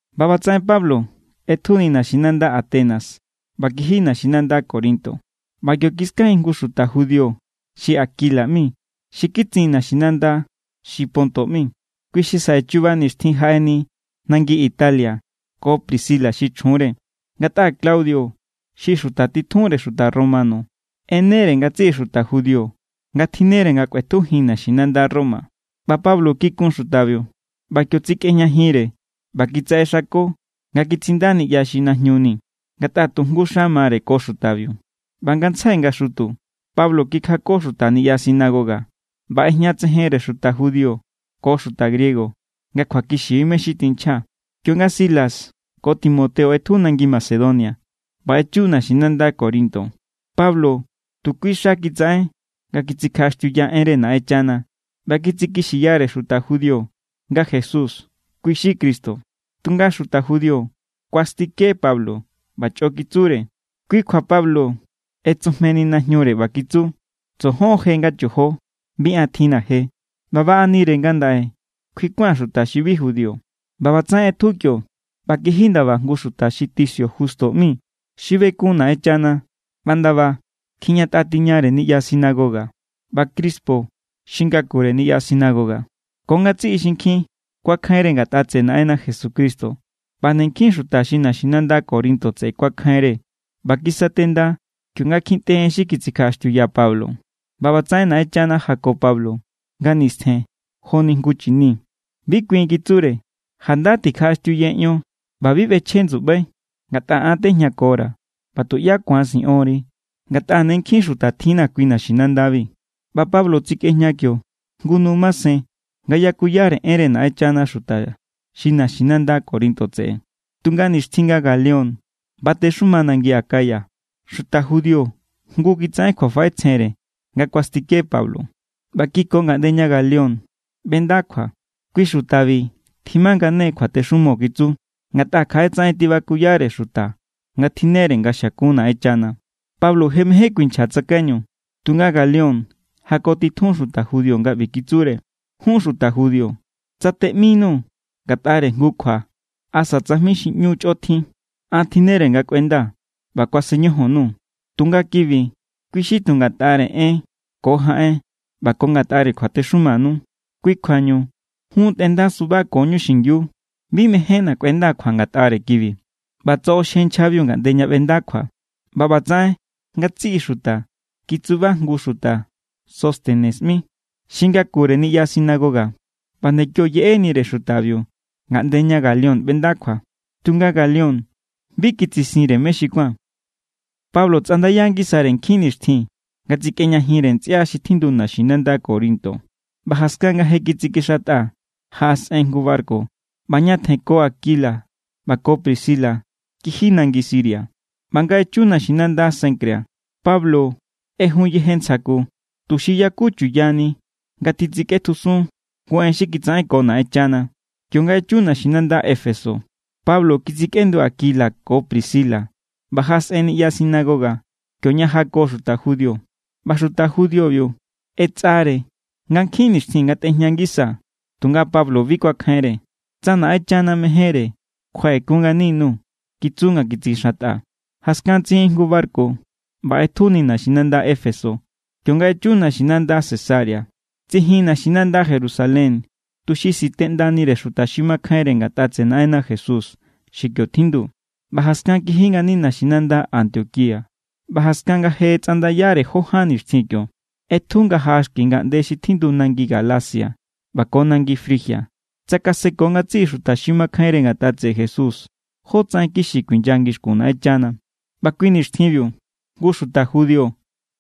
ꞌBa ꞌbatsaꞌen Pablo ꞌetjuni naxinanda Atenas ꞌba kiji naxinanda Corinto. ꞌBa kio kiskajin jngu xuta judío xi Aquila ꞌmi, xi kitsin naxinanda xi Ponto ꞌmi. Kui xi saꞌe chuba nixtjin jaꞌeni nangi Italia ko Priscila xi chjunre, ngatꞌa Claudio xi xuta titjunre xuta romano ꞌenere ngatsiꞌi xuta judío nga tjinnere nga kꞌuetjujin naxinanda Roma. ꞌBa Pablo kikun xutabiu. ꞌBa kio tsikꞌejñajinre ꞌba kitsaꞌexako nga kitsinda niꞌya xi najñu ni, ngatꞌa tujngu xa mare ko xutabiu. ꞌBa ngantsjai nga xutu Pablo kikjako xuta niꞌya sinagoga ꞌba ꞌejñatsejenre xuta judío ko xuta griego nga kjuakixi= mé= xi tinchja. Kionga Silas ko Timoteo ꞌetju nangi Macedonia ꞌba echu naxinanda Corinto, Pablo tu kui xa kitsaꞌen nga kitsikjaꞌaxtiuya enre Naꞌenchana ꞌba kitsikixiyare xuta judío nga Jesús kui= xi Cristo. Tunga xuta judío kuastike Pablo ꞌba chꞌo kitsure. Kui kjua Pablo ꞌetsujmeni najñure, ꞌba kitsure: —Tsojon= je nga chojo. Bi an tjinna̱ je. ꞌBa baꞌanire ngandaꞌe kjuikuan xuta xi bi judío. ꞌBa ꞌbatsaꞌen ꞌetju kio ꞌba kiji ndaba jngu xuta xi Ticio Justo ꞌmi, xi bekun Naꞌenchana ꞌba ndaba kjijñatꞌa tiñare niꞌya sinagoga. ꞌBa Crispo, xi ngakure niꞌya sinagoga, ko ngatsiꞌi xinkjin kuakjainre ngatꞌa tseꞌe Naꞌenna Jesucristo. ꞌBa nde nkjin xuta xi naxinanda Corinto tseꞌe kuakjainre ꞌba kisatenda kionga kjintꞌe en xi titsikjaꞌaxtiuya Pablo. ꞌBa ꞌbatsaꞌen Naꞌenchana jako Pablo nga nistjen joni jngu chini: —Bi kuin —kitsure—. Janda tikjaꞌaxtiuye ion ꞌba bi ꞌbechje ndsuꞌbai. Ngatꞌa an tejñakora̱, ꞌba tuꞌyá ku̱an siꞌonri. Ngatꞌa ne nkjin xuta tjinna̱ kui naxinandabi. ꞌBa Pablo tsikꞌejña kio jngu nu masen nga yakuyare enre Naꞌenchana xuta xi naxinanda Corinto tseꞌe. Tunga nixtjin nga Galión batexuma nangi Acaya, xuta judío jngu kitsaꞌen kjuafaꞌetsjenre nga kuastike Pablo. ꞌBa kiko ngaꞌnde ña Galión ꞌbenda kjua. —Kui xutabi tjimangane kjuatexumo —kitsu—. Ngatꞌa kjaꞌe tsaꞌen tibakuyare xuta nga tjinnere nga xiakun Naꞌenchana. Pablo je mején kuinchja tsakaiñu, tunga Galión jakotitjun xuta judío nga ꞌbi kitsure: —Jun xuta judío, tsa teꞌminuu̱ ngatꞌare jngu kjua asa tsajmi xi ꞌñu chꞌotjin, an tjinnere nga kꞌuendaa̱ ꞌba kuasen ñojon_nuu̱. Tunga kibi, kui xi tu ngatꞌare en ko jaꞌen ꞌba ko ngatꞌare kjuatexumanu. Kui kjuañu jun tꞌendasubakoñu xingiu. Bi mejénna̱ kꞌuendaa̱ kjua ngatꞌare kibi. ꞌBa tsoꞌoxje nchjabiu ngaꞌnde ña ꞌbenda kjua. ꞌBa ꞌbatsaꞌen ngatsiꞌi xuta kitsuba jngu xuta Sóstenes ꞌmi, xi ngakure niꞌya sinagoga, ꞌba nde kio yeꞌenire xutabiu ngaꞌnde ña Galión ꞌbenda kjua. Tunga Galión bi kitsisinre mé xi kuán. Pablo tsꞌandaya ngisare nkjin nixtjin nga tsikꞌejñajinre ntsꞌia xi tjindu naxinanda Corinto. ꞌBa jaskan nga je kitsikixantꞌa, jaꞌasꞌen jngu barku ꞌba ñatjen ko Aquila ꞌba ko Priscila kiji nangi Siria. ꞌBa nga echu naxinanda Cencrea, Pablo ꞌejun yeje ntsja ku, tuxi yaku chuyani nga titsikꞌetjusun jngu en xi kitsaꞌenko Naꞌenchana. Kionga echu naxinanda Éfeso, Pablo kitsikꞌendu Aquila ko Priscila ꞌba jaꞌasꞌen niꞌya sinagoga, kioña jako xuta judío. ꞌBa xuta judíobiu ꞌetsꞌare nga nkjin nixtjin ngatꞌejña ngisa, tunga Pablo bi kuakjainre. —Tsa Naꞌenchana mejénre, kjuaꞌekun ngani_nuu̱ —kitsu nga kitsikixantꞌa. Jaskan tsijin jngu barku ꞌba ꞌetjuni naxinanda Éfeso. Kionga echu naxinanda Cesarea, tsijin naxinanda Jerusalén tuxi sitꞌendanire xuta xi makjainre ngatꞌa tseꞌe Naꞌenna Jesús xi kio tjindu, ꞌba jaskan kiji ngani naxinanda Antioquía. ꞌBa jaskan nga je tsꞌandayare jó ján nixtjin kio, ꞌetju nga jaꞌa xki ngaꞌnde xi tjindu nangi Galacia ꞌba ko nangi Frigia. Tsakaseko ngatsiꞌi xuta xi makjainre ngatꞌa tseꞌe Jesús jotsaꞌen kixi kuinya ngixkun Naꞌenchana. ꞌBa kui nixtjinbiu jngu xuta judío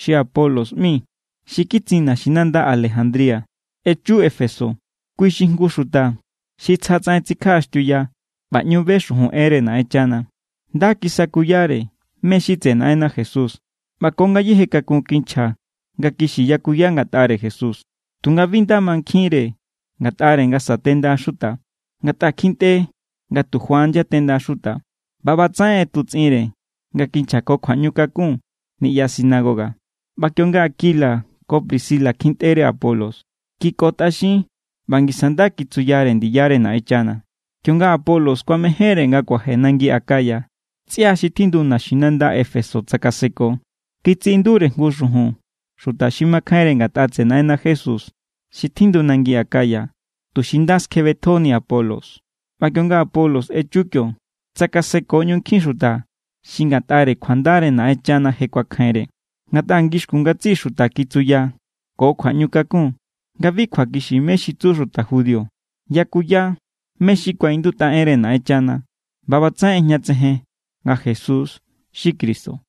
xi Apolos ꞌmi, xi kitsin naxinanda Alejandría, echu Éfeso. Kui xi jngu xuta xi tsja tsaꞌen tsikjaꞌaxtiuya ꞌba ꞌñu be xujun enre Naꞌenchana. Nda kisakuyare mé= xi tseꞌe Naꞌenna Jesús ꞌba ko ngayéje kakun kinchja nga kixi yakuya ngatꞌare Jesús. Tunga bi nda mankjinre ngatꞌare nga satenda xuta, ngatꞌa kjintꞌe nga tu Juan yatenda xuta. ꞌBa ꞌbatsaꞌen ꞌetutsꞌinre nga kinchja ko kjuaꞌñukakun niꞌya sinagoga. ꞌBa kionga Aquila ko Priscila kjintꞌere Apolos, kikotꞌaxin ꞌba ngisa nda kitsuyare ndiyare Naꞌenchana. Kionga Apolos kuamejénre nga kuaje nangi Acaya, ntsꞌia xi tjindu naxinanda Éfeso tsakaseko. Kitsiꞌindure jngu xujun xuta xi makjainre ngatꞌa tseꞌe Naꞌenna Jesús xi tjindu nangi Acaya, tuxi nda skjebetjoni Apolos. ꞌBa kionga Apolos echu kio, tsakaseko ꞌñu nkjin xuta xi ngatꞌare kjuandare Naꞌenchana je kuakjainre. Ngatꞌa ngixkun ngatsiꞌi xuta kitsuya ko kjuaꞌñukakun nga bi kjuakixi mé= xi tsu xuta judío. Yakuya mé= xi kuaꞌindutꞌa enre Naꞌenchana ꞌba ꞌbatsaꞌen ꞌejñatsejen nga Jesús xi Cristo.